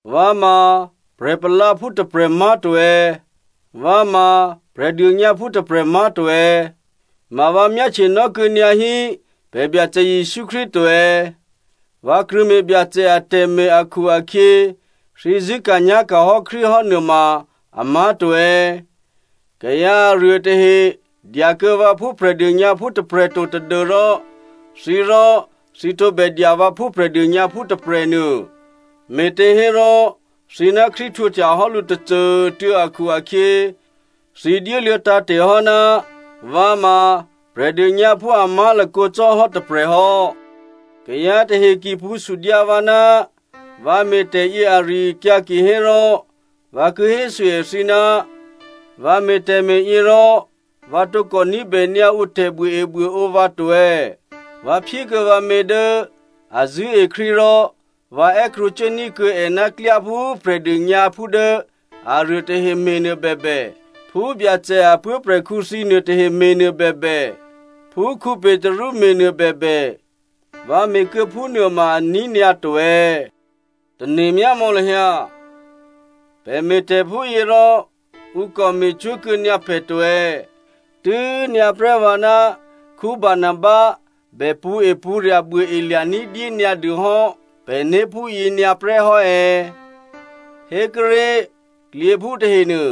Vǎ ma prè̤palǎphú tôprè̤ má̤to è̌? Vǎ ma Prè̤dônyǎphú tôprè̤ má̤to è̌? Ma vǎ myáhtyenò́ kuô̌ nyǎ hí pè̤ Byacè Jesǔ Krístu to è̌? Vǎ krṳ̂̌me̤ Byacè atè̤me̤ akhu-akhyě, thǐ zṳ̂́ka̤nyá̤ka̤ hò́ Krístu hò́ nuôma amá̤to è̌? Kayǎ aruô tahe dyakuô̌ vǎ phú Prè̤dônyǎphú tôprè̤ to tadû́rò thǐ rò thǐ tǒbè dya vǎ phú Prè̤dônyǎphú tôprè̤nuô. Me̤těhérò thǐ ná Krístu htwǒhtya hò́ lǔ tôcô꤮ tuô̌ akhu-akhyě, thǐ dyéluô̌ tǎ̤te̤ hò́ ná vǎ ma Prè̤dônyǎphú a má̤lakǒ cò́ hò́ tôprè̤ hò́. Kayǎ tahe ki pṳ̌ sudyǎ vǎ ná vǎ me̤tè̤ yě ari-akyǎ kihérò vǎ ki hésû èthǐ, vǎ me̤ tè̤me̤yě rò vǎ tǒkò ní̤bè nyǎ ǔ tè̤buôebuôǒ vǎ to è̌? Vǎ phyé kuô̌ vǎmě dố a zṳ̂́e Krístu rò vǎ è́krwǒcuốní̤ kuô̌ è ná klyá phú Prè̤dônyǎphú dố aruô tahe me̤nuô bèbè, phú Byacè a puố̤prè̤khǔ thǐ nuôtahe me̤ nuô bèbè, phú Petru me̤ nuô bèbè, vǎ me̤ kuô̌ phúnuô ma aní̤ nyǎ to è̌? Tane̤myá mò̌ lahyǎ. Pè̤ me̤tè̤ phúyě rò ǔ kò me̤cwó̤ kuô̌ nyǎ pè̤ to è̌? Tû́nyǎ prè́ vǎ ná Barnaba bè pṳ̌epṳ̌rya̤ buôelya̤ ní̤dyé nyǎ dû hò́ pè̤né̤ phúyě nyǎ prè́ hò́ è̌? Hékuốré̤, klyěphú tahenuô,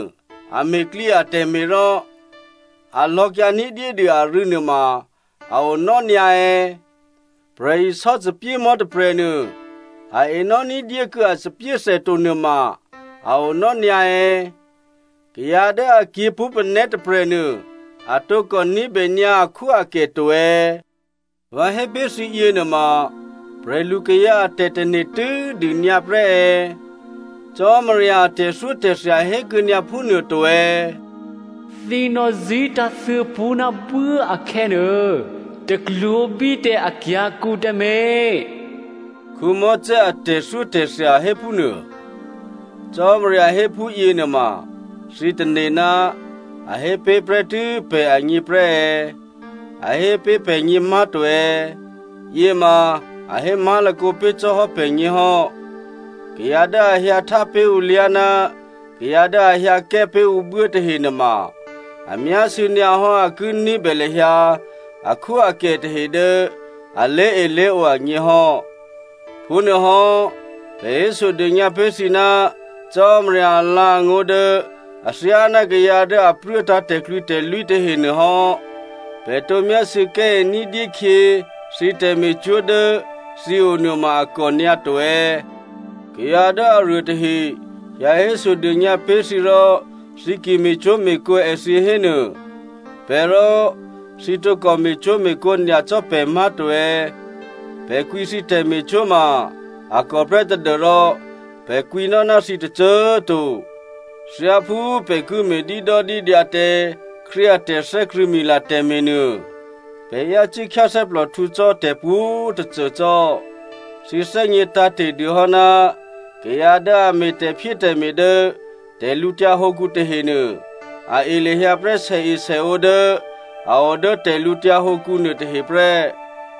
a me̤ klyě atè̤me̤ rò a lò̌kyǎ ní̤dyédû arû̌ nuôma a onò́ nyǎ è̌? Prè̤isò́ thòbǐthèmò̤́ tôprè̤nuô, a enò́ ní̤dyé kuô̌ a thòbǐthè to nuôma a onò́ nyǎ è̌? Kayǎ dố a kyě̤ pṳ́panè̤́ tôprè̤nuô, a tǒkò ní̤bè nyǎ akhwóakè to è̌? Vǎ hé pé̤ thǐ yěnuôma prè̤lukayǎ a tè̤tane̤ tû́dû nyǎ prè́ è̌? Cò́marya a tè̤thyótè̤thya hé kuô̌ nyǎ phúnuô to è̌? “Thǐ nò̌zí̤tǎ̤thyě pṳ́ ná buố akhè̌nuô, taklwǒ̤bí tǎ akyǎ̤kǔ tǎmé̤” Mosè a tè̤thyótè̤thya hé phúnuô. Cò́marya hé phúyěnuôma thǐ tane̤ ná a hé pé̤ prè́tû́ pṳ́ agně prè́ è̌? A hé pé̤ pè̤gně má̤to è̌? Yěma a hé má̤lakǒ pé̤ cò́ hò́ pè̤gně hò́. Kayǎ dố a hyǎ htá pé̤ ǔ lyá̤ ná kayǎ dố a hyǎ kè́ pé̤ ǔ buố tahenuôma, a myásû̌ nyǎ hò́ dố a ki ní̤bè lahyǎ akhwóakè tahe dố a lé̤elé̤ǒ agně hò́. Phúnuôhò́, pè̤ hésodônyǎ pé̤ thǐ ná Cò́marya alǎ̤angó̤ dố athyáná kayǎ dố a pruốtǎ̤ tè̤klwǐtè̤lwí tahenuô hò́. Pè̤ tǒ myásû̌ kè́e ní̤dyé khyě thǐ tè̤me̤cwó̤ dố thǐ o nuôma a kònyǎ to è̌? Kayǎ dố aruô tahe hyǎ hésodônyǎ pé̤ thǐ rò thǐ ki me̤cwó̤me̤kǒ èthǐ hénuô, pè̤ rò thǐ tǒkò me̤cwó̤me̤kǒ nyacò́ pè̤ má̤to è̌? Pè̤ kwǐ thǐ tè̤me̤cwó̤ ma a kò prè́ tadû́rò pè̤ kwǐnò́ ná thǐ tôcô꤮ to. Thyáphú pè̤ ki me̤ dídòdídyǎ tǎ Krístu a tè̤thè́krṳ̂̌mila tè̤me̤nuô, pè̤ yácû́ khyáthè́plòhtǔ cò́ tè̤pwǒ̤꤮ tôcô cò́. Thǐ thè́gně tǎ̤te̤ dû hò́ ná kayǎ dố a me̤ tè̤phyétè̤me̤ dố tè̤lǔtyǎ hǒkǔ tahenuô, a e lahyǎ prè́ sèesèǒ dố a o dố tè̤lǔtyǎ hǒkǔ nuôtahe prè́.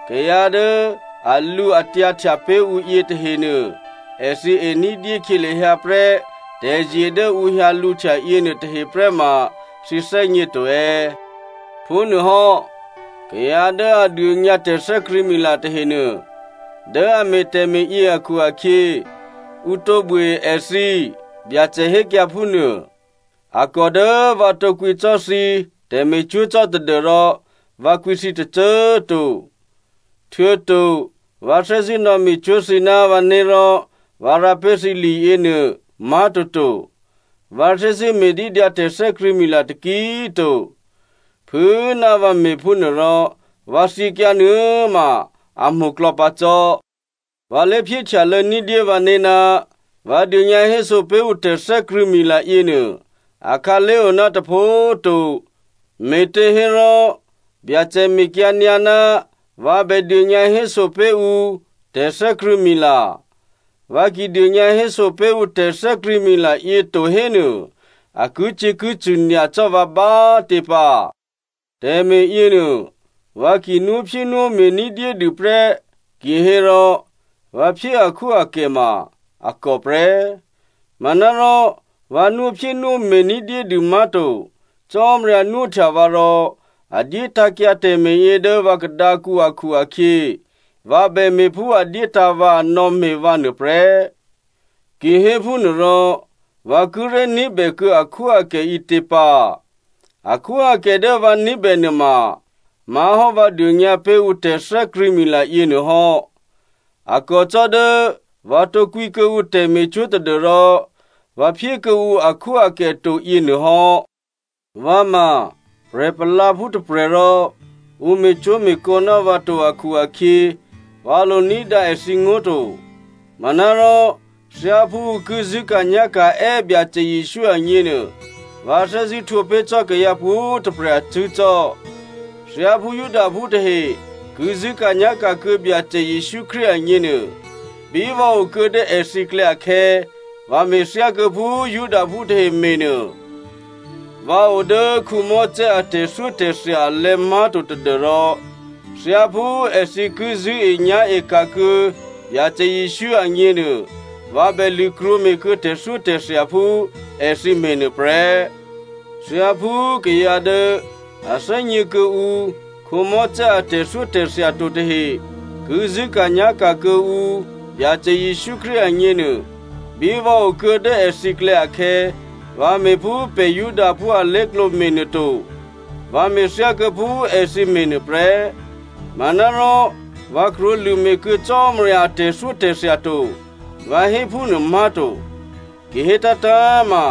Kayǎ dố alǔatyǎhtya pé̤ ǔ yětahenuô, èthǐ e ní̤dyé khyě lahyǎ prè́ tè̤zye dố ǔ hyǎ lǔhtya yěnuô tahe prè́ ma thǐ thè́gně to è̌? Phúnuôhò́ kayǎ dố a dônyǎ tè̤thè́krṳ̂̌mila tahenuô, dố a me̤ tè̤me̤yě akhu-akhyě, ǔ tǒ buôe èthǐ, Byacè hékyǎ phúnuô. A kò dố vǎ tǒkwǐ cò́ thǐ tè̤me̤cwó̤ cò́ tadû́rò vǎ kwǐ thǐ tôcô꤮ to. Htuô̌to vǎ thè́zṳ̂́ nò̌me̤cwó̤ thǐ ná vǎné̤ rò vǎ rǎ pé̤ thǐ liyěnuô má̤toto. Vǎ thè́zṳ̂́ me̤dídyǎ tè̤thè́krṳ̂̌mila taki꤮ to. Phû꤮ ná vǎ me̤phúnuôrò, vǎ thyěkyǎ nuô꤮ ma a mo̤klò̌ pǎ cò́. Vǎ lé̤phyéhtyalô̌ ní̤dyé vǎné̤ ná vǎ dônyǎhéso pé̤ ǔ tè̤thè́krṳ̂̌mila yěnuô akhǎlé̤ o ná tôpho꤮ to, me̤těhérò Byacè mekyǎ nyǎ ná vǎ bè dônyǎhéso pé̤ ǔ tè̤thè́krṳ̂̌mila. Vǎ ki dônyǎhéso pé̤ ǔ tè̤thè́krṳ̂̌mila yě to hénuô, a kicyě̤kicṳ̂ nyacò́ vǎ bá꤮ tě pǎ. Tè̤me̤ yěnuô vǎ ki nwóphyénwóme̤ ní̤dyédû prè́ kihérò, vǎ phyé akhwóakè ma a kò prè́. Manárò vǎ nwóphyénwóme̤ ní̤dyédû má̤to. Cò́marya nwóhtya vǎ rò a dyétǎ̤kyǎ tè̤me̤yě dố vǎ khadǎkǔ akhu-akhyě, vǎ bè me̤ phú a dyétǎ̤ vǎ, a nò̌me̤ vǎ nuôprè́. Kihéphúnuôrò, vǎ kíré̤ ní̤bè kuô̌ akhwóakè ǐtě pǎ? Akhwóakè dố vǎ ní̤bè nuôma má̤hò́ vǎ dônyǎ pé̤ ǔ tè̤thè́krṳ̂̌mila yěnuô hò́, a kò cò́ dố vǎ tǒ kwǐ kuô̌ǔ tè̤me̤cwó̤ tadû́rò vǎ phyé kuô̌ǔ akhwóakè to yěnuô hò́. Vǎ ma prè̤palǎphú tôprè̤ rò ǔ me̤cwó̤me̤kǒ nò́ vǎ to akhu-akhyě, vǎ lo ní̤dǎ èthǐngó̤ to. Manárò thyáphú ǔ ki zṳ̂́ka̤nyá̤ka̤ è́ Byacè Jesǔ agněnuô, vǎ thè́zṳ̂́ htwǒ pé̤ cò́ kayǎ pwǒ̤꤮ tôprè̤ acṳ̂́ cò́. Thyáphú Judaphú tahe ki zṳ̂́ka̤nyá̤ka̤ kuô̌ Byacè Jesǔ Krístu agněnuô, bí vǎ o kuô̌ dố èthǐklè̌ akhè̌, vǎ me̤ thyákuô̌ phú Judaphú tahe me̤ nuô. Vǎ o dố Mosè a tè̤thyótè̤thya alè̤̌ má̤to tadû́rò thyáphú èthǐ ki zṳ̂́enyá̤e ka̤ kuô̌ Byacè Jesǔ agněnuô, vǎ bè lṳ̂krwǒ me̤kuô̌ tè̤thyótè̤thya phú èthǐ me̤ nuô prè́. Thyáphú kayǎ dố a thè́gně kuô̌ǔ Mosè a tè̤thyótè̤thya to tahe ki zṳ̂́ka̤nyá̤ka̤ kuô̌ǔ Byacè Jesǔ Krístu agněnuô, bí vǎ o kuô̌ dố èthǐklè̌ akhè̌, vǎ me̤phú pè̤ Judaphú alé̤klǒ me̤nuô to, vǎ me̤ thyákuô̌ phú èthǐ me̤nuô prè́. Manárò vǎ krwǒlṳ̂ me̤ kuô̌ Cò́marya a tè̤thyótè̤thya to, vǎ hé phúnuô má̤to. Ki hétǎ̤tǎ̤ma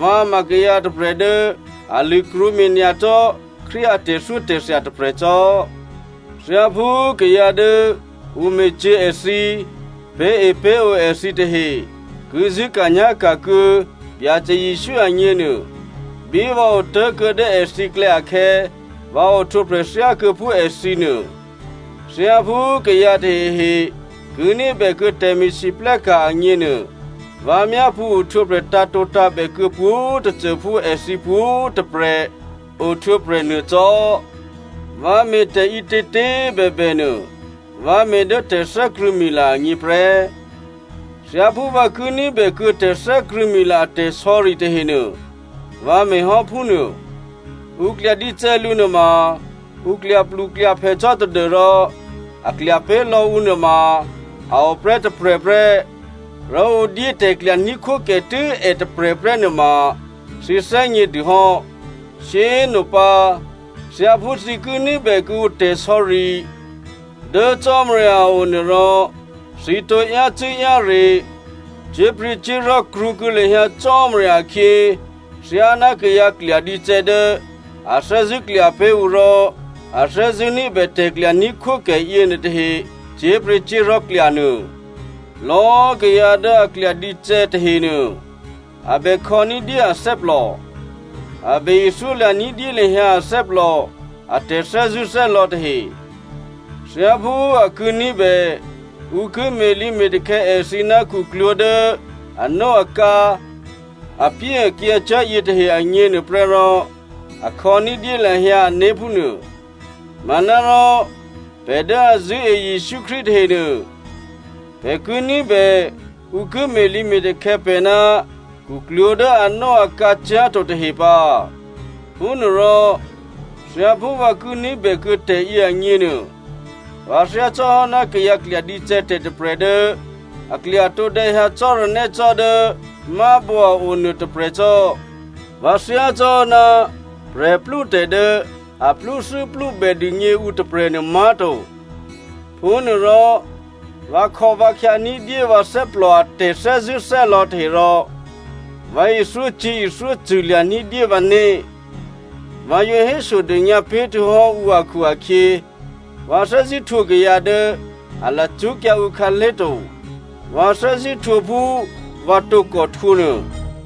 vǎ ma kayǎ tôprè̤ dố a lṳ̂krwǒ me̤ nyacò́ Krístu a tè̤thyótè̤thya tôprè̤ cò́. Thyáphú kayǎ dố ǔ me̤cyě̤ èthǐ, pé̤epé̤ǒ èthǐ tahe ki zṳ̂́ka̤nyá̤ka̤ kuô̌ Byacè Jesǔ agněnuô, bí vǎ otố̤kuô̌ dố èthǐklè̌ akhè̌, vǎ ohtwǒprè̤ thyákuô̌ phú èthǐ nuô. Thyáphú kayǎ tahehe ki ní̤bè kuô̌ tè̤me̤lwóhteka̤ agněnuô, vǎ myápṳ̌ ohtwǒprè̤ tǎ̤tǒtǎ̤bè kuô̌ pwǒ̤꤮ tôcô phú èthǐ pwǒ̤꤮ tôprè̤ ohtwǒprè̤ nuô cò́. Vǎ me̤ tè̤ǐtětě꤮ bèbè nuô, vǎ me̤ dố tè̤thè́krṳ̂̌mila agně prè́. Thyáphú vǎ ki ní̤bè kuô̌ tè̤thè́krṳ̂̌mila a tè̤sò̌ri tahenuô, vǎ me̤ hò́ phúnuô. Ǔ klya dícè̌ lǔ nuôma, ǔ klyapluklyaphè cò́ tadû́rò a klya pé̤ lò̌ ǔ nuôma a o prè́ tôprè̤ prè́, rò ǔ dyé tè̤klya ní̤khwókè tû́ è tôprè̤ prè́ nuôma thǐ thè́gnědû hò́! Shyé꤮ nopǎ, thyáphú thǐ ki ní̤bè kuô̌ǔ tè̤sò̌ri dố Cò́marya a o nuô rò thǐ tǒ yácû́-yáre, cyé̤pryě̤cyé̤li̤ krwǒkuô̌ lahyǎ Cò́marya akhyě thyáná kayǎ klyadícè̌ dố a thè́zṳ̂́ klya pé̤ ǔ rò a thè́zṳ̂́ ní̤bè tè̤klya ní̤khwókè yěnuô tahe cyé̤pryě̤cyé̤li̤ klya nuô. Lò̌꤮ kayǎ dố a klyadícè̌ tahenuô, a bè khò̌ní̤dyé athè́plò, a bè ithyólya̤ ní̤dyé lahyǎ athè́plò a tè̤thè́zṳ̂́thè́lò̌ tahe. Thyáphú a ki ní̤bè ǔ ki me̤lǐme̤takhè̌ èthǐ ná khuklwǒ̤ dố anóakǎ, apyéakyǎcyá̤ yětahe agněnuô prè́ rò, a khò̌ ní̤dyé lahyǎ ané̤ phúnuô. Manárò pè̤ dố a zṳ̂́e Jesǔ Krístu tahenuô, pè̤ ki ní̤bè ǔ ki me̤lǐme̤takhè̌ pè̤ ná khuklwǒ̤ dố anóakǎcyá̤ to tahe pǎ. Phúnuôrò, thyáphú vǎ ki ní̤bè kuô̌ tè̤yě agněnuô, vǎ thyácò́hò́ ná kayǎ klyadícè̌ tè̤ tôprè̤ dố a klya tǒdè̌ hyǎ cò́ranè́ cò́ dố mábǒ a o nuô tôprè̤ cò́. Vǎ thyácò́hò́ ná prè̤plútè̤ dố a plúthû́plúbè dûgně ǔ tôprè̤nuô má̤to. Phúnuôrò vǎ khò̌, vǎ khyá ní̤dyé vǎ thè́plò a tè̤thè́zṳ̂́thè́lò̌ tahe rò vǎ ithyócyě̤ ithyócṳ̂ lya̤ ní̤dyé vǎné̤. Vǎ yǒ hésodônyǎ pé̤ htuô̌hò́ ǔ akhu-akhyě, vǎ thè́zṳ̂́ htwǒ kayǎ dố a lacṳ́kyǎ ǔ khǎlé̤ to, vǎ thè́zṳ̂́ htwǒ phú vǎ tǒkò htwǒ nuô.